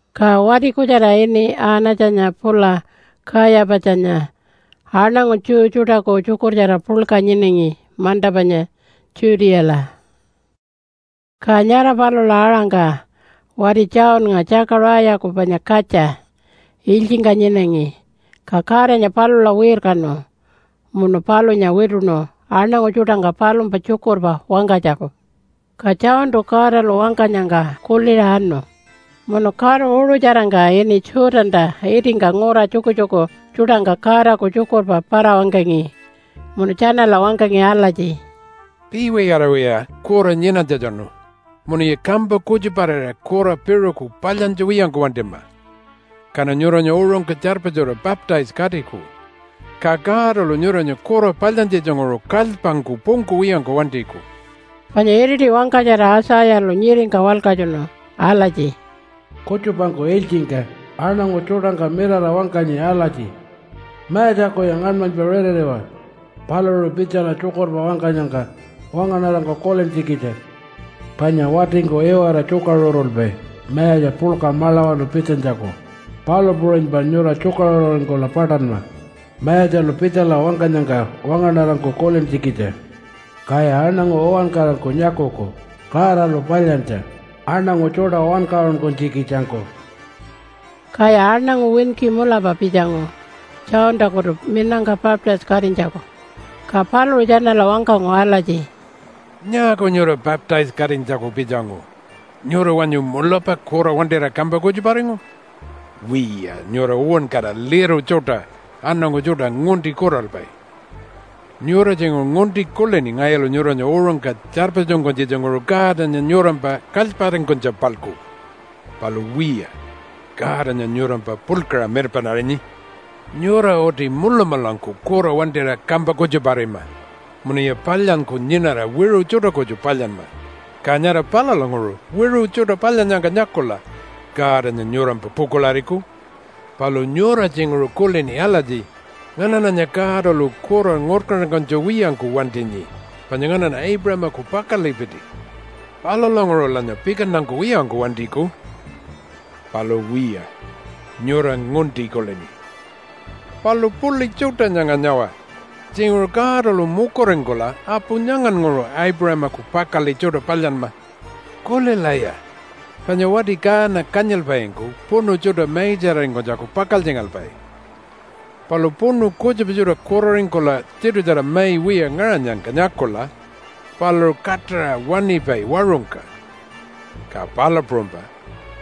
Ka wati kutjara ini Anatjanya pula Kayapatjanya aṉangu Jew tjuṯaku tjukurtjara puḻka nyinangi manta panya Judeala. Ka nyara palula aṟangka wati Johnnga, Tjakaṟayaku panya katja, ilytjingka nyinangi, ka Godanya palula wirkanu munu palunya wituṉu aṉangu tjuṯangka palumpa tjukurpa wangkanytjaku. Ka Johntu Godalu wangkanyangka kuliṟa anu munu karu uṟutjarangka ini Jordanta itingka ngura tjukutjuku tjuṯangka Godaku tjukurpa para-wangkangi, munu tjanala wangkangi alatji, “Piiwiyariwaya kura nyinanytjatjanu munuya kampa kutjuparira kura piṟuku palyantja wiyangku wantima, kaṉa nyuranya uṟungka tjarpatjura baptise-katiku, ka Godalu nyuranya kura palyantjitjanguṟu kalypangku pungkuwiyangku wantiku.” Panya iriti wangkatjara Aitjayalu nyiringka walkatjunu alatji, “Kutjupangku ilytjingka aṉangu tjuṯangka mirara wangkanyi alatji, ‘Mayatjakuya ngaṉmanypa ritiriwa paluṟu pitjala tjukurpa wangkanyangka wangaṉarangku kulintjikitja. Panya watingku iwara tjukaṟurulpai mayatja puḻka maḻawanu pitjanytjaku, palu puṟunypa nyura tjukaṟururingkula paṯanma Mayatjalu pitjala wangkanyangka wangaṉarangku kulintjikitja. Kaya aṉangu uwankarangku nyakuku Godalu palyantja aṉangu tjuṯa wankaṟunkunytjikitjangku.’” Kaya aṉangu winki mulapa pitjangu Johntakutu minangka baptise-katinytjaku. Ka paluṟu tjanala wangkangu alatji, “Nyaaku nyura baptise-katinytjaku pitjangu? Nyura wanyu mulapa kura wantira kampa kutjuparingu? Wiya, nyura uwankara liru tjuṯa aṉangu tjuṯa ngunti kuralpai! Nyura tjinguṟu ngunti kulini ngayulu nyuranya uṟungka tjarpatjunkunytjitjanguṟu Godanya nyurampa kalyparingkunytja-palku. Palu wiya, Godanya nyurampa puḻkaṟa mirpaṉarinyi. Nyura uti mulamulangku kura wantira kampa kutjuparima munuya palyanyku nyinara wiṟu tjuṯa kutju palyanma, ka nyara palulanguṟu wiṟu tjuṯa palyannyangka nyakula Godanya nyurampa pukuḻariku. Palu nyura tjinguṟu kulini alatji, ‘Nganaṉanya Godalu kura ngurkantankunytja wiyangku wantinyi panya nganaṉa Aipuṟamaku pakaḻipiti. Palulanguṟulanya pikantankuwiyangku wantiku.’ Palu wiya, nyura ngunti kulini. Palu puḻi tjuṯa nyanga nyawa! Tjinguṟu Godalu mukuringkula apu nyangannguṟu Aipuṟamaku pakaḻi tjuṯa palyanma. Kulilaya! Panya wati kaana kanyilpaingku puṉu tjuṯa maitjararingkunytjaku pakaltjingalpai, palu puṉu kutjupa tjuṯa kuraringkula tiṯutjara mai wiya ngaṟanyangka nyakula paluṟu kaṯaṟa waṉipai waṟungka, ka palu puṟunypa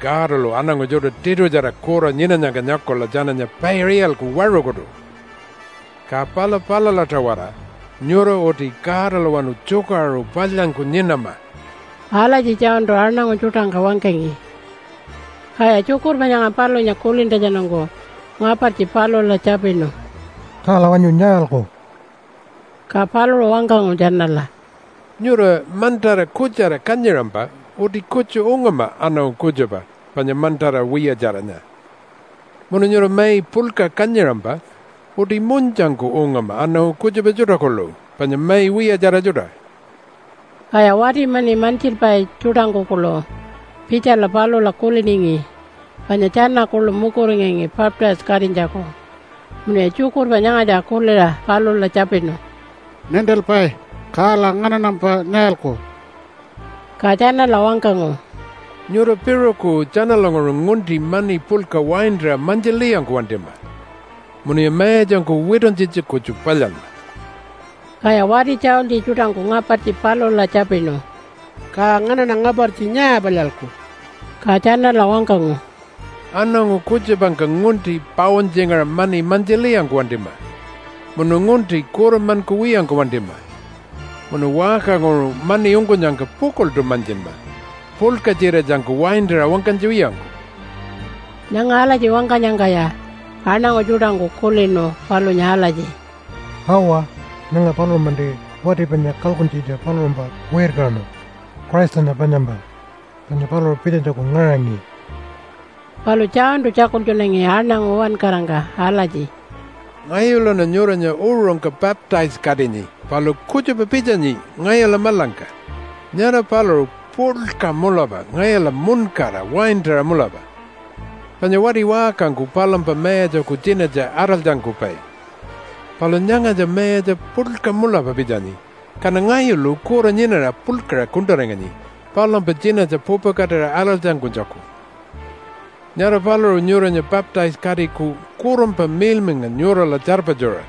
Godalu aṉangu tjuṯa tiṯutjara kura nyinanyangka nyakula tjananya paiṟa iyalku waṟukutu. Ka pala palula-tawara nyura uti Godalawanu tjukaṟuru palyanyku nyinama.” Alatji Johntu aṉangu tjuṯangka wangkangi. Kaya tjukurpa nyanga palunya kulintjatjanungku ngapartji palula tjapinu, “Kala wanyu nyaalku?” Ka paluṟu wangkangu tjanala, “Nyura mantara kutjara kanyiṟampa uti kutju ungama aṉangu kutjupa panya mantara wiyatjaranya. Munu nyura mai puḻka kanyiṟampa uti munytjangku ungama aṉangu kutjupa tjuṯa kuḻu panya mai wiyatjara tjuṯa.” Kaya wati mani mantjilpai tjuṯangku kuḻu pitjala palula kuliningi, panya tjana kuḻu mukuringangi baptise-katinytjaku. Munuya tjukurpa nyangatja kuliṟa palula tjapinu, “Nintilpai, kala nganaṉampa nyaalku?” Ka tjanala wangkangu, “Nyura piṟuku tjanalanguṟu ngunti mani puḻka waintaṟa mantjilwiyangku wantima, munuya mayatjangku wituntjitja kutju palyanma.” Kaya wati tjaultji tjuṯangku ngapartji palula tjapinu, “Ka nganaṉa ngapartji nyaa palyalku?” Ka tjanala wangkangu, “Aṉangu kutjupangka ngunti pauntjingaṟa mani mantjilwiyangku wantima munu ngunti kuranmankuwiyangku wantima munu waṟkanguṟu mani ungkunyangka pukuḻṯu mantjinma, puḻka-tjiratjangku waintaṟa wangkanytja wiyangku.” Nyanga alatji wangkanyangkaya aṉangu tjuṯangku kulinu palunya alatji, “Awa, nyanga paluṟu-manti wati panya kalkuntjitja paluṟumpa wirkanu Christanya panyampa, panya paluṟu pitjanytjaku ngaṟangi.” Palu Johntu tjakultjunangi aṉangu uwankarangka alatji, “Ngayuluṉa nyuranya uṟungka baptise-katinyi palu kutjupa pitjanyi ngayula maḻangka. Nyara paluṟu puḻka mulapa ngayula muṉkara waintaṟa mulapa. Panya wati waṟkangku palumpa mayatjaku tjinatja araltjankupai, palu nyangatja mayatja puḻka mulapa pitjanyi, kaṉa ngayulu kura nyinara puḻkaṟa kuṉṯaringanyi palumpa tjinatja pupakatira araltjankunytjaku. Nyara paluṟu nyuranya baptise-katiku Kurunpa Miḻmiḻnga nyurala tjarpatjuṟa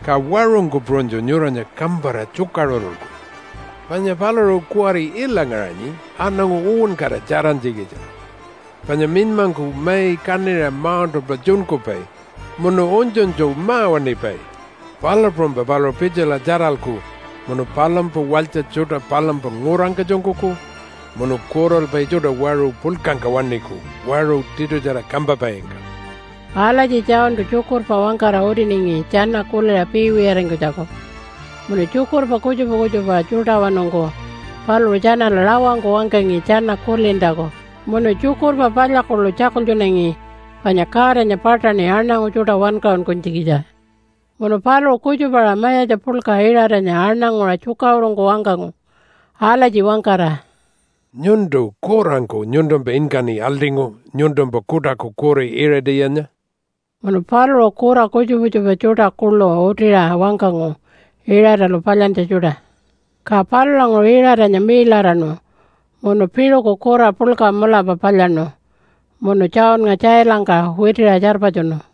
ka waṟungku puṟunytju nyuranya kampara tjukaṟurulku. Panya paluṟu kuwari ila ngaṟanyi aṉangu uwankara tjarantjikitja, panya minymangku mai kaṉiṟa mauṉṯalpa tjunkupai munu unytjunytju ma-waṉipai, palu puṟunypa paluṟu pitjala tjaralku munu palumpa walytja tjuṯa palumpa ngurangka tjunkuku munu kuralpai tjuṯa waṟu puḻkangka waṉiku waṟu tiṯutjara kampapaingka.” Alatji Johntu tjukurpa wangkara utiningi tjana kuliṟa piiwiyaringkunytjaku. Munu tjukurpa kutjupa kutjupa tjuṯawanungku paluṟu tjanala rawangku wangkangi tjana kulintjaku, munu tjukurpa palya kuḻu tjakultjunangi panya Godanya paṯaṉi aṉangu tjuṯa wankaṟunkunytjikitja. Munu paluṟu kutjupa-aṟa mayatja puḻka Iṟatanya aṉanguṟa tjukaṟurungku wangkangu alatji wangkara, “Nyuntu kurangku nyuntumpa inkaṉi aḻṯingu nyuntumpa kuṯaku kuri Iṟatiyanya.” Munu paluṟu kura kutjupa kutjupa tjuṯa kuḻu utiṟa wangkangu Iṟatalu palyantja tjuṯa. Ka palulanguṟu Iṟatanya miiḻaraṉu munu piṟuku kura puḻka mulapa palyaṉu munu Johnnga tjailangka witiṟa tjarpatjunu.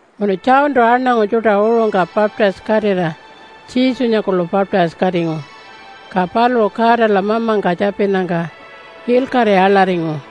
Munu Johntu aṉangu tjuṯa uṟungka baptise-katira Jesunya kuḻu baptise-katingu. Ka paluṟu Godala mamangka tjapinnyangka ilkaṟi aḻaringu,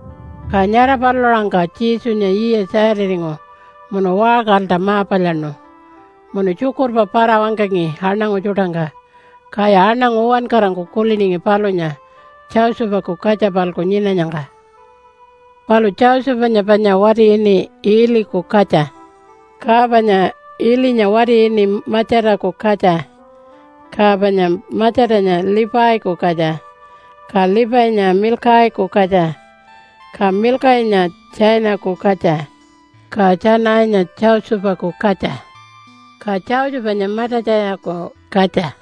Ka nyara palula aṟangka Jesunya yiya 30-ringu munu waṟkalta ma-palyaṉu munu tjukurpa para-wangkangi aṉangu tjuṯangka. Kaya aṉangu uwankarangku kuliningi palunya Josephaku katja-palku nyinanyangka. Palu Josephanya panya wati ini Iiliku katja, ka panya Iilinya wati ini Matjataku katja, ka panya Matjatanya Leviku katja, ka Levinya Milkaiku katja, ka Milkainya Tjanaiku katja, ka Tjanainya Josephaku katja, ka Josephanya Matatjayaku katja,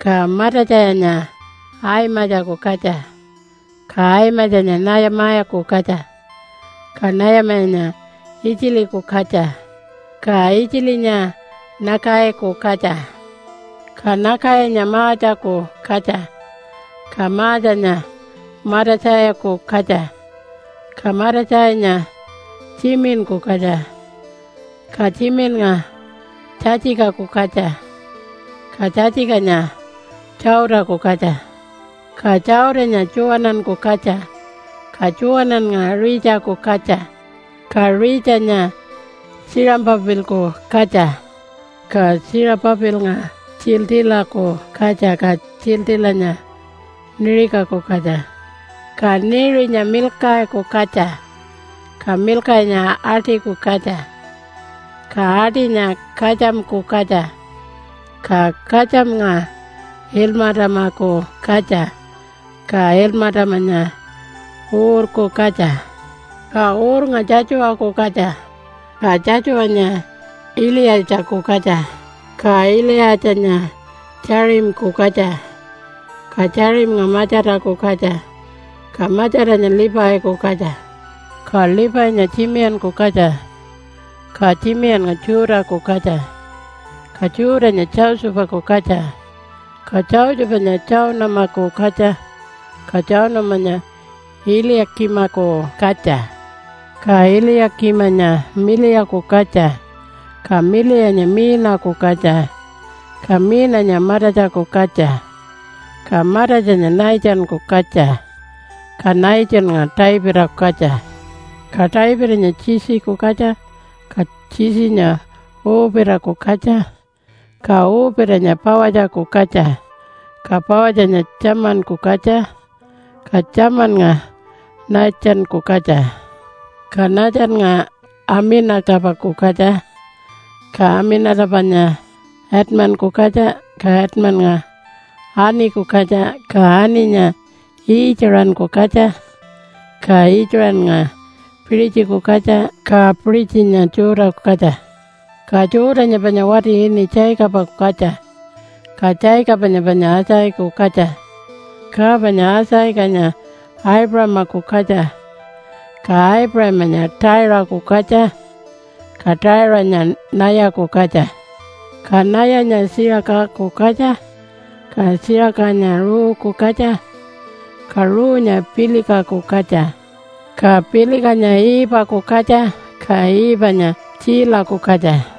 ka Matatjayanya Aimatjaku katja, ka Aimatjanya Nayamaku katja, ka Nayamanya Itjiliku katja, ka Itjilinya Nakaiku katja, ka Nakainya Maatjaku katja, ka Maatjanya Matatjaiku katja, ka Matatjainya Tjiminku katja, ka Tjiminnga Tjatjikaku katja, ka Tjatjikanya Tjautaku katja, ka Tjautanya Tjuwananku katja, ka Tjuwanannga Ritjaku katja, ka Ritjanya Tjiṟapapilku katja, ka Tjiṟapapilnga Tjiiltiilaku katja, ka Tjiiltiilanya Neṟiku katja, ka Neṟinya Milkaiku katja, ka Milkainya Atiku katja, ka Atinya Katjamku katja, ka Katjamnga Ilmatamaku katja, ka Ilmatamanya Uurku katja, ka Uurnga Tjatjuwaku katja, ka Tjatjuwanya Iliyatjaku katja, ka Iliyatjanya Tjaṟimku katja, ka Tjaṟimnga Matjataku katja, ka Matjatanya Leviku katja, ka Levinya Tjimiyanku katja, ka Tjimiyannga Judah-ku katja, ka Judah-nya Josephaku katja, ka Josephanya Tjaunamaku katja, ka Tjaunamanya Iliya-kimaku katja, ka Iliya-kimanya Miliyaku katja, ka Miliyanya Miinaku katja, ka Miinanya Matatjaku katja, ka Matatjanya Nathanku katja, ka Nathannga Davidaku katja, ka Davidanya Jesse-ku katja, ka Jesse-nya Uupitaku katja, ka Uupitanya Pawatjaku katja, ka Pawatjanya Tjamanku katja, ka Tjamannga Naatjanku katja, ka Naatjannga Amina-tapaku katja, ka Amina-tapanya Adminku katja, ka Adminnga Arniku katja, ka Arninya Iitjiṟanku katja, ka Iitjaṟannga Piṟitjiku katja, ka Piṟitjinya Judah-ku katja, ka Judah-nya panya wati ini Jacobaku katja, ka Jacobanya panya Isaacaku katja, ka panya Isaacanya Aipuṟamaku katja, ka Aipuṟamanya Taiṟaku katja, ka Taiṟanya Nayaku katja, ka Nayanya Tjiṟakaku katja, ka Tjiṟakanya Ruuku katja, ka Ruunya Pilikaku katja, ka Pilikanya Iipaku katja, ka Iipanya Tjiilaku katja,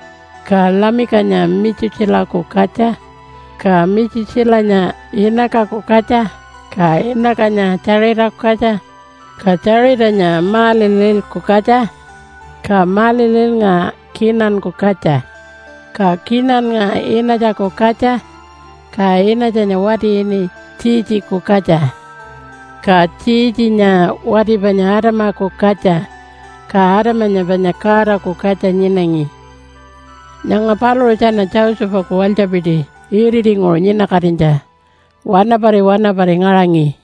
ka Lamikanya Mitjutjilaku katja, ka Mitjutjilanya Inakaku katja, ka Inakanya Tjaṟitaku katja, ka Tjaṟitanya Maalalilku katja, ka Maalalilnga Kinanku katja, ka Kinannga Inatjaku katja, ka Inatjanya wati ini Tjiitjiku katja, ka Tjiitjinya wati panya Adamaku katja, ka Adamanya panya Godaku katja nyinangi. Nyanga paluṟu tjana Josephaku walytjapiti iritinguṟu nyinakatinytja wanapari wanapari ngaṟangi.